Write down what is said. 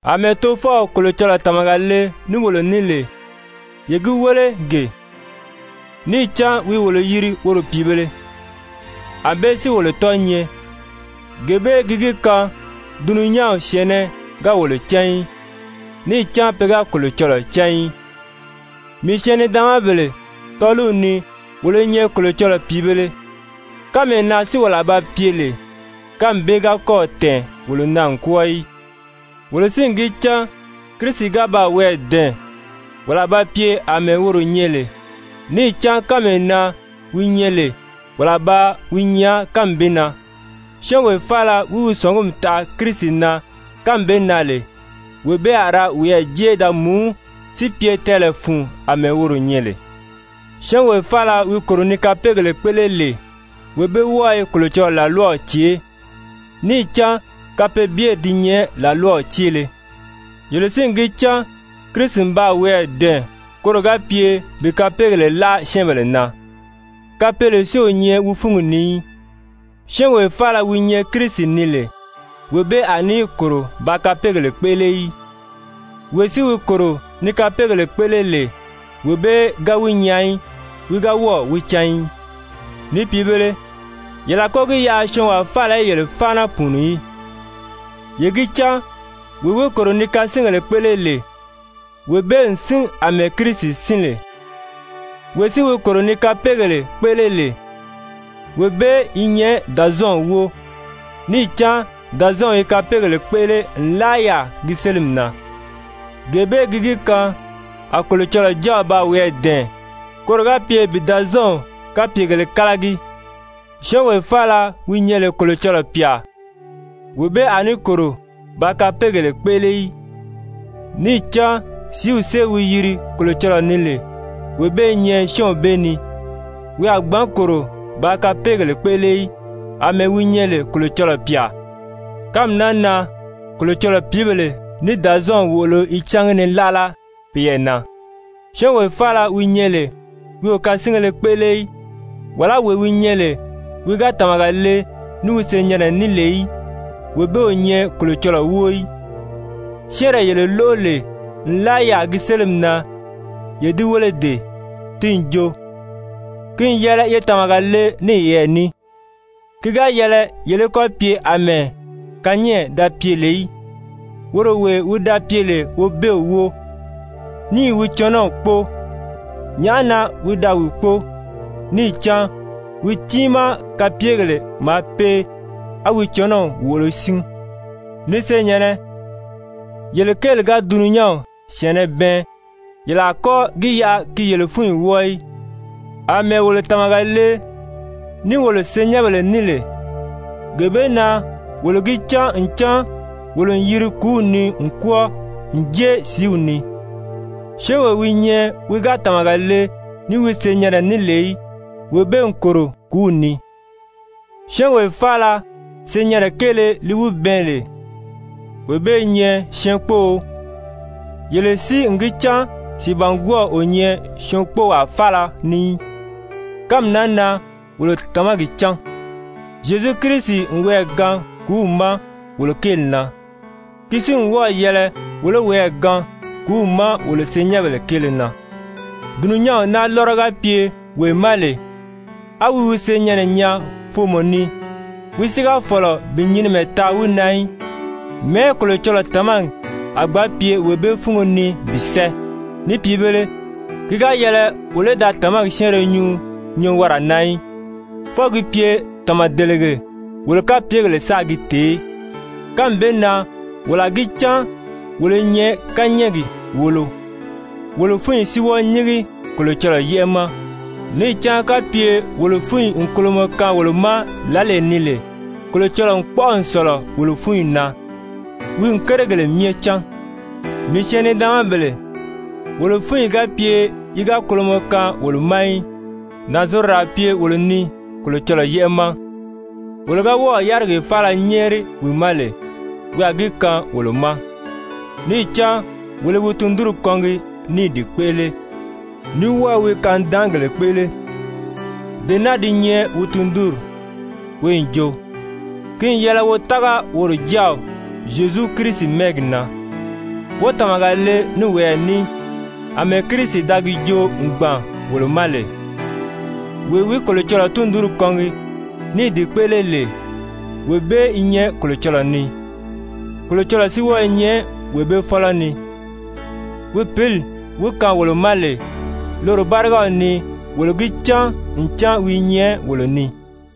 Amɛɛ Tofɔw Kolocɔlɔɔ tàmaga le ní wolo ní lè, ye gi wéle gee, níì cán wi i wolo yiri woro pìibēle! Anbée si wolo tɔ́ɔ̄ nyɛ. Gee bee gi gi kaan dulunyanw syɛ̀ɛnnɛ ga wolo cán í, níì cán pe ga Kolocɔlɔɔ cán í. Mii syɛɛn-nidaanmabèle, tɔ́ɔliw ni wolo i nyɛ Kolocɔlɔɔ pìibēle, kánmee na si wolo a ba pye lè, kánmi bee ga kɔ́ɔ̀ tɛ̀ɛn wolo na n kwɔ́ɔ í. Wolo si n gi cán Kirisi ga baa wiyɛɛ dɛ̀ɛn, wolo a ba pye àmɛɛ woro nyɛ lè, níì cán kánmee na wi nyɛ lè, wolo a ba wi nyaa kánmi bee na. Syɔ́ɔnwee faala wi wi sɔ̀ngumi taʔa Kirisi na kánmi bee na lè, wee bee a ra wiyɛɛ jé da mùú si pye tɛɛlɛ fun àmɛɛ woro nyɛ lè. Syɔ́ɔnwee faala wi kòro ni kapeegèle kpéʔele lè wee bee wɔ́ɔ i Kolocɔlɔɔ làlwaw cèʔé, níì cán kapeebyeri di nyɛ làlwaw céele. Yele si n gi cán Kirisi n baa wiyɛɛ dɛ̀ɛn koro ga pye bi kapeegèle láʔa syɛ́ɛnbèle na. Kapeele si o nyɛ wi fúngi ni í. Syɔ́ɔnwee faala wi nyɛ Kirisi ni lè, wee bee a ní kòro bàā kapeegèle kpéʔele í. Wee si wi kòro ni kapeegèle kpéʔele lè, wee bee ga wi nyaa í, wi ga wɔ́ɔ̀ wi cán í. Ni pìibēle, yele a kɔ́ gi yaʔa syɔɔnwaa faala í yele fáana pùuni í. Ye gi cán wee wi kòro ni kasingèle kpéʔele lè, wee bee n sín àmɛɛ Kirisi sín lè. Wee si wi kòro ni kapeegèle kpéʔele lè, wee bee i nyɛ Dàzɔɔnw wóo, níì cán Dazɔɔnw i kapeegèle kpéʔele nlaa yaà gi sélimi na. Gee bee gi gi kaan a Kolocɔlɔɔ Jáaw baa wiyɛɛ dɛ̀ɛn koro ga pye bi Dazɔɔnw kapyegèlē kálagi. Syɔ́ɔnwee faala wi nyɛ lè Kolocɔlɔɔ pyà, wee bee a ní kòro bàā kapeegèle kpéʔele í, níì cán sìíw sée wi yiri Kolocɔlɔɔ ni lè, wee bee i nyɛ syɔ́ɔnw bee ni, wi a gbǎn kòro bàā kapeegèle kpéʔele í, àmɛɛ wi nyɛ lè Kolocɔlɔɔ pyà. Kánmi naa na Kolocɔlɔɔ pìíbèle ní Dazɔɔnw wòolo i cángi ni láʔala peyɛɛ na. Syɔ́ɔnwee faala wi nyɛ lè wi o kasingéle kpéʔele í, wàlá wee wi nyɛ lè wi ga tàmaga le ní wi senyɛnnɛ ní lè í, wee bee o nyɛ Kolocɔlɔɔ wóo í. Syɛ́ɛnree yele lóʔo lè nlaa yaà gi sélimi na, ye di wéle dee, ti n jo, ki n yɛlɛ ye tàmaga le ní yeyɛɛ ní. Ki ga yɛlɛ yele í kɔ́ pye àmɛɛ Kayɛn da pye lè í, woro wee wi da pye lè Wobeew wóo, níì wi cɔnɔw kpóo. Nyàʔá na wi da wi kpóo? Níì cán wi tiimaa kapyegèle maa pee á wi cɔnɔw wòʔolo sín. Ni senyɛ̀nnɛ, yele kéeli ga dulunyanw syɛ̀ɛnnɛ bɛɛn yele a kɔ́ gi yaʔa gi yele fúnyi wɔ́ɔ í. Amɛɛ wolo tàmaga le ní wolo senyɛnbèle ní lè, gee bee na wolo gi cán ncan wolo n yiri kùúw ni n kwɔ́ɔ n jée sìíw ni. Syɔ́ɔnwee wi nyɛ wi ga tàmaga le ní wi senyɛnnɛ ní lè í, wee bee n kòro kùúw ni. Syɔ́ɔnwee faala senyɛnnɛ kéele li wi bɛɛn lè wee bee i nyɛ syɛɛnkpóō. Yele si n gi cán sìibangwɔɔw o nyɛ syɛɛnkpoowaa faala ni í. Kánmi naa na wolo tàmagi cán, Zyezu Kirisi n wiyɛɛ gaan kùúw ma wolo kéeli na. Ki si n wɔ́ɔ̀ yɛlɛ wolo í woyɛɛ gaan kùúw ma wolo senyɛnbèle kéele na. Dulunyanw naa lɔ́rɔ ga pye wee ma lè á wi wi senyɛnnɛ nyaa foomɔ ni, wi si ga fɔ̀lɔ bi nyinimɛ taa wi na í, mɛ̀ɛ́ Kolocɔlɔɔ tàmagi a gbǎn pye wee bee fúngo ni bi sɛ́ɛ? Ni pìibēle, ki ga yɛlɛ wolo í da tàmagi syɛ́ɛnrɛ nyuu nyɔɔwara na í, fwɔɔ gi pye tàmadelege, wolo kapyegèle sáā gi tèé. Kánmi bee na wolo a gi cán wolo i nyɛ kányɛɛgi wòolo, wolo fúnyi si wɔ́ɔ nyíngi Kolocɔlɔɔ yɛ́ʔɛ ma. Níì cán kapye wolo fúnyi n kolomɔ kaan wolo ma lǎlee ni lè, Kolocɔlɔɔ n kpɔ́ʔɔ n sɔ̀lɔ wolo fúnyi na, wi n kérigèle myɛ cán. Mii syɛɛn-nidaanmabèle, wolo fúnyi ga pye yi ga kolomɔ kaan wolo ma í, nànzorodo a pye wolo ni Kolocɔlɔɔ yɛ́ʔɛ ma. Wolo ga wɔ́ɔ̀ yárigee faala nyɛ́ɛri wi ma lè, wi a gi kaan wolo ma, níì cán wolo i wi tundunri kɔngi ní i di kpéʔele, ní wɔ́ɔ i wi kanidaangèle kpéʔele. Dee naa di nyɛ wi tundunri, wi n jo, ki n yɛlɛ wo tága woro Jáaw Zyezu Kirisi mɛ́ɛgi na, wó tàmaga le ní woyɛɛ ní àmɛɛ Kirisi da gi joo n gbàn wolo ma lè. Wee wi Kolocɔlɔɔ tundunri kɔngi ní i di kpéʔele lè, wee bee i nyɛ Kolocɔlɔɔ ni, Kolocɔlɔɔ si wɔ́ɔ i nyɛ wee bee fɔ́lɔ ni. Wi Pǐli wi kaan wolo ma lè, loro bárigaw ni wolo gi cán ncan wi i nyɛ wolo ni.